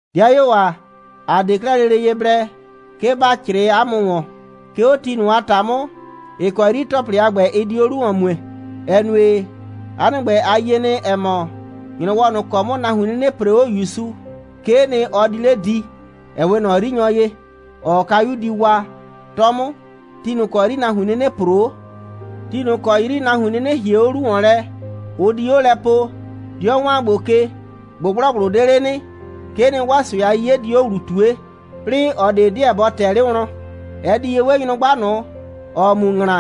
'Dɩayuo ‑a, ‑a 'de 'klɛɛ lele ye blɛ, 'ke ‑ba 'crɩɩ 'a mʋ ‑wɔn, 'ke 'o ti ꞊nʋ a ‑ta 'mʋ, ‑ɩ kɔ 'yri ‑tɔplɩ a ‑gbɛ, ɩ di 'o 'lu ‑wɔn mue, ‑ɛ nue, 'a nɩ ‑gbɛ, a yie nɩ, ‑ɛ mɔ, ‑nyrɔwɔ ꞊nʋ ‑kɔ 'mʋ nahuin 'nɩnɩ ‑pree 'o ‑Yusu, 'kee nɩ, ɔ di 'le di, ‑ɛ 'we ꞊nɔ 'yrinyɔ ye, ‑ɔɔ kayu di wa, 'tɔ 'mʋ, ti ꞊nʋ ‑kɔ 'yri nahuin 'nɩnɩ ‑proo 'o. Ti ꞊nʋ ‑kɔ 'yri nahuin 'nɩnɩ ‑hie 'o 'lu ‑wɔn lɛ, ʋ di 'o lɛ poo: «'Dɩɔ ‑wan gbo ke, ꞊gbʋgblɔgbʋ 'de 'le nɩ,» 'kee nɩ, 'waa ꞊sʋɛ a 'yiye di 'o ‑wlu ꞊tue, 'plɩɩ ꞊ɔ ꞊de 'deɛ bɔ ꞊tɛɛ 'le wlɔn. Ɛ di ye 'we nyrʋgba ꞊nʋ, ‑ɔɔ mu ‑ŋla,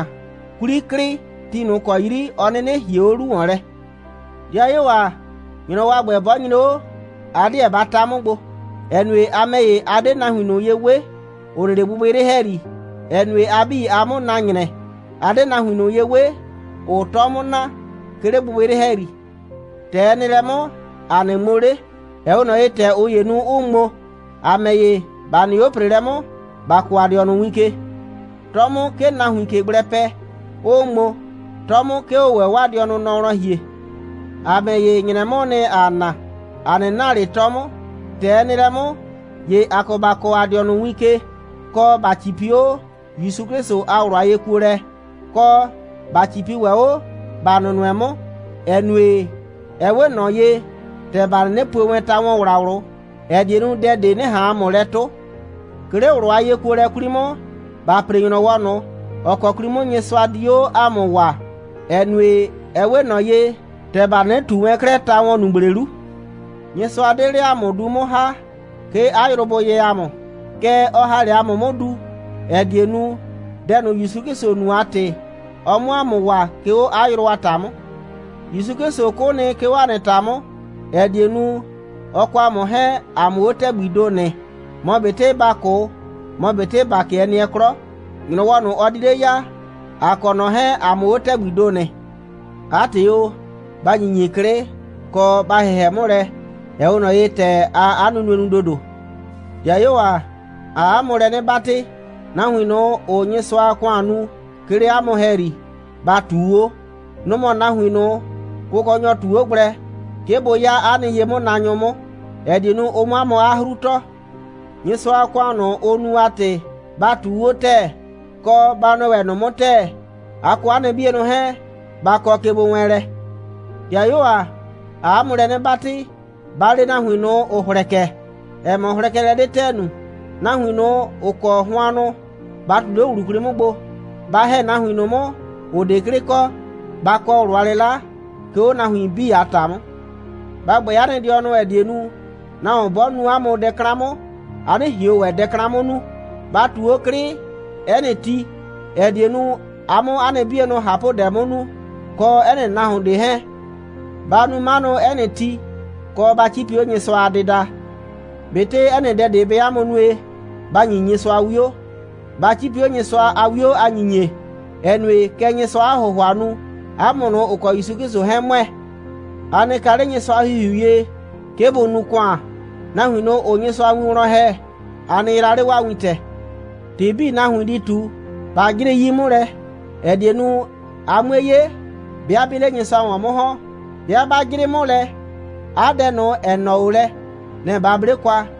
'kwli klɩ, ti ꞊nʋ ‑kɔ 'yri ɔ 'nɩnɩ ‑hie 'o 'lu ‑wɔn lɛ. 'Dɩayuo ‑a, ‑nyrɔwɔ a ‑gbɛ 'bɔ nyre 'o, a 'deɛ ba ta 'mʋ gbo, ‑ɛ nue, a ‑mɛ ‑ye, a 'de nahuin ꞊nʋ ye 'we, ‑ʋ nɩ 'le gbɩgbɩyrɩ ‑hɛyri, ‑ɛ nue, a 'bii, aa 'mʋ na ‑nyrɛ. ‑A 'de nahuin ꞊nʋ ye 'we, ‑ʋʋ 'tɔ 'mʋ na, 'ke 'le gbɩgbɩyrɩ ‑hɛyri. ‑Tɛ ɛ nɩ lɛ 'mʋ, ‑a 'nɩ ŋmo 'le, ‑ɛ 'we ꞊nɔ ye, ‑tɛ ꞊ʋ ‑yee nu, 'ʋʋ ŋmo. ‑A ‑mɛ ‑ye, ‑ba nɩ 'o ‑preelɛ 'mʋ, ‑ba kɔɔ ‑a dɩɔnʋ win ke. 'Tɔ 'mʋ, 'ke nahuiin ꞊ke gblɛ pɛ, 'ʋʋ ŋmo, 'tɔ 'mʋ, 'ke ʋʋ ‑wɛ 'waa dɩɔnʋ nɔ wlɔn ‑hie. ‑A ‑mɛ ‑ye, ‑nyrɛ 'mʋʋ nɩ, ‑aa na. ‑A 'nɩ na ꞊le 'tɔ 'mʋ. ‑Tɛ ɛ nɩ lɛ 'mʋ, ‑ye ‑a kɔ ‑ba kɔɔ ‑a nɩ dɩɔnʋ win ke, kɔ, ‑ba 'cipi 'o ‑Yusu 'Klɩsʋ a ꞊wlʋ a yekuolɛ, kɔ, ‑ba 'cipi ‑wɛ 'o, ‑ba nʋnʋɛ 'mʋ, ‑ɛ nue, ɛ 'we ꞊nɔ ye, ‑tɛ ‑ba 'nɩnɩ pue wɛn ta‑wɔnwlawlʋ, ‑ɛ die nu, dɛ ꞊de 'nɩ ꞊han ‑a mʋ lɛ 'tʋ. 'Ke 'le ꞊wlʋ a yekuolɛ 'kwli 'mʋ, ‑ba ‑pre ‑nyrɔwɔ ꞊nʋ, ‑ɔ kɔ 'kwli 'mʋ Nyɩsʋa di 'o ‑a mʋ waa, ‑ɛ nue, ɛ 'we ꞊nɔ ye, ‑tɛ ‑ba 'nɩnɩ ꞊tu wɛn 'klɛɛ ta‑wɔnnugble 'lu. Nyɩsʋa 'de 'le ‑a mʋ du 'mʋ ‑ha, 'ke 'a yrʋ bʋ yɛ ‑a mʋ. Kɛɛ, ɔ ‑ha 'le ‑a mʋ 'mʋ du, ‑ɛ die nu, dɛ ꞊nʋ ‑Yusu 'Klɩsʋ nu a ‑tɩ, ɔ 'mʋ ‑a mʋ waa, 'ke 'o 'a yrʋ a ‑ta 'mʋ. ‑Yusu 'Klɩsʋ 'kʋ nɩ, 'ke 'o ‑a nɩ ‑ta 'mʋ, ‑ɛ die nu, ɔ kɔ ‑a mʋ 'hɛɛn, ‑a 'mʋ 'o ‑tɛgbii ‑do nɩ. Mɔ ꞊betɩ ‑ba 'kʋ, mɔ ꞊betɩ ‑ba 'kɩɛ nɩɛ 'klɔ, ‑nyrɔwɔ ꞊nʋ, ɔ di 'le ya, ‑a kɔ ꞊nɔ 'hɛɛn, ‑a 'mʋ 'o ‑tɛgbii ‑do nɩ. 'A ‑tɩ o, ba ‑nyinyi 'klɩ, kɔ, ba ‑hɩhɛ 'mʋ lɛ, ‑ɛ 'we ꞊nɔ ye, ‑tɛ aa 'a nunue nu ‑dodo. 'Dɩayuo ‑a, ‑aa 'a mʋ lɛ 'nɩ 'batɩ, nahuin ꞊nʋ, ‑ʋʋ Nyɩsʋa a ‑kʋan nu, 'ke 'le 'a mʋ ‑hɛyri, ba ꞊tuu 'o. Nʋ‑ mɔ nahuin ꞊nʋ, Kʋkɔnyɔ ꞊tu 'o gblɛ, 'ke bʋ 'ya 'a nɩ ye'mʋnaanyʋ 'mʋ, ‑ɛ die nu, ʋ 'mʋ 'a mʋ 'a 'hru tɔɔ. Nyɩsʋa a ‑kʋan ꞊nʋ, ʋʋ nu a ‑tɩ, ba ꞊tuu 'o ‑tɛɛ, kɔ, ba nʋɛ ‑wɛ ꞊nʋ 'mʋ ‑tɛɛ. A kɔ 'a nɩ 'bienʋ 'hɛɛn, ba kɔ kegbowɛɛnlɛ. 'Dɩayuo ‑a, ‑aa 'a mʋ lɛ 'nɩ 'batɩ, ba le nahuin ꞊nʋ, ‑ʋ hlɛkɛ, ‑ɛ mɔ, hlɛkɛlɛ 'de ‑tɛɛ nu. Nahuin ꞊nʋ, ‑ʋ kɔ hʋannʋ, ba ꞊tu 'le ꞊wlʋ 'kwli 'mʋ gbo. Ba ‑hɛ nahuin ꞊nʋ 'mʋ, ‑ʋ 'de 'klɩ kɔ. Ba kɔ ꞊wlʋ a 'lɩla, 'ke 'o nahuin 'bii a ‑ta 'mʋ. Ba ‑gbɛɛ 'a nɩ dɩɔnʋ, ‑ɛ die nu, nahuon 'bɔ nu 'a mʋ dɛ 'klan 'mʋ, a 'nɩ ꞊hion ‑wɛ dɛ 'klan 'mʋ nu. Ba ꞊tu 'o 'klɩ 'ɛ nɩ ti, ‑ɛ die nu, a 'mʋ 'a nɩ 'bienʋ ꞊hapʋdɛ 'mʋ nu, kɔ 'ɛ nɩ nahuon ꞊de 'hɛɛn. Ba nu 'manʋ, 'ɛ nɩ ti, kɔ, ba 'cipi 'o Nyɩsʋa a dɩda. ꞊Betɩ 'ɛ nɩ dɛ ꞊de bɛɛ 'a mʋ nue, ba ‑nyi Nyɩsʋa 'wio. Ba 'cipi 'o Nyɩsʋa a 'wio a ‑nyinyie, ‑ɛ nue, kɛ Nyɩsʋaa 'a ‑hʋhʋa nu, 'a mʋ ꞊nʋ, ‑ʋ kɔ ‑Yusu 'Klɩsʋ 'hɛɛn ‑mʋɛ. A nɩ ka 'le Nyɩsʋa a ‑Hihiu ye, 'ke bʋ nu ‑kʋan. Nahuin ꞊nʋ, ‑ʋʋ Nyɩsʋa win wlɔn ‑hɛ, a nɩ yraa 'le 'waa wintɛ. ‑Tɩ 'bii, nahuin di ꞊tu, ba 'jrɩ 'yi 'mʋ lɛ, ‑ɛ die nu, a 'mue 'ye, 'bɩa 'bɩɩ 'le Nyɩsʋa ‑wɔn 'mʋ ‑hɔn. 'Bɩa 'ba 'jrɩ 'mʋ lɛ, 'a dɛ ꞊nʋ, ‑ɛ nɔɔ 'o lɛ, nɛ‑ ba 'ble kwa.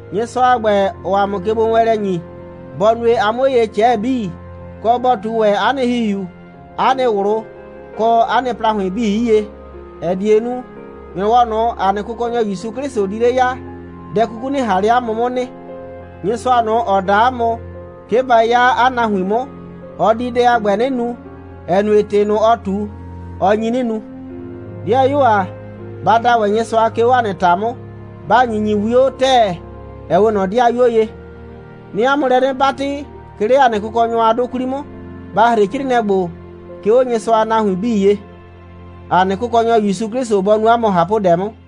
Nyɩsʋa a ‑gbɛ, ‑ɔɔ ‑a mʋ kegbowɛɛnlɛ ‑nyi, bɔ nue, a 'mʋ 'o ye ꞊cɛɛ 'bii, kɔ, bɔ ꞊tu ‑wɛ 'a nɩ ‑hihiu, 'a nɩ ꞊wlʋ, kɔ 'a nɩ ‑plahʋɩn 'bii 'yie, ‑ɛ die nu, ‑nyrɔwɔ ꞊nʋ, ‑a nɩ Kʋkɔnyɔ ‑Yusu 'Klɩsʋ di 'le ya, dɛ 'kuku 'nɩ ꞊han 'le 'a mʋ 'mʋ nɩ. Nyɩsʋa ꞊nʋ, ‑ɔ da 'a mʋ, 'ke ba 'ya 'a nahuin 'mʋ, ɔ di dɛ a ‑gbɛ 'nɩ nu, ‑ɛ nue, ‑tɩ ꞊nʋ, ɔ ꞊tu, ɔ nyi 'nɩ nu. 'Dɩayuo ‑a, ba da ‑wɛ Nyɩsʋa, 'ke 'o ‑a nɩ ‑ta 'mʋ. Ba ‑nyinyi 'wio ‑tɛɛ, ‑ɛ 'we ꞊nɔ 'dɩayuo ye. 'Nɩɩ 'a mʋ lɛ 'nɩ 'batɩ, 'ke 'le ‑a nɩ Kʋkɔnyɔ a 'dʋ 'kwli 'mʋ, ba ‑hre 'crɩɩnɩɛ ‑gbo, 'ke 'o Nyɩsʋa a nahuin 'bii ye. ‑A nɩ Kʋkɔnyɔ ‑Yusu 'Klɩsʋ bɔ nu 'a mʋ ꞊hapʋdɛ 'mʋ.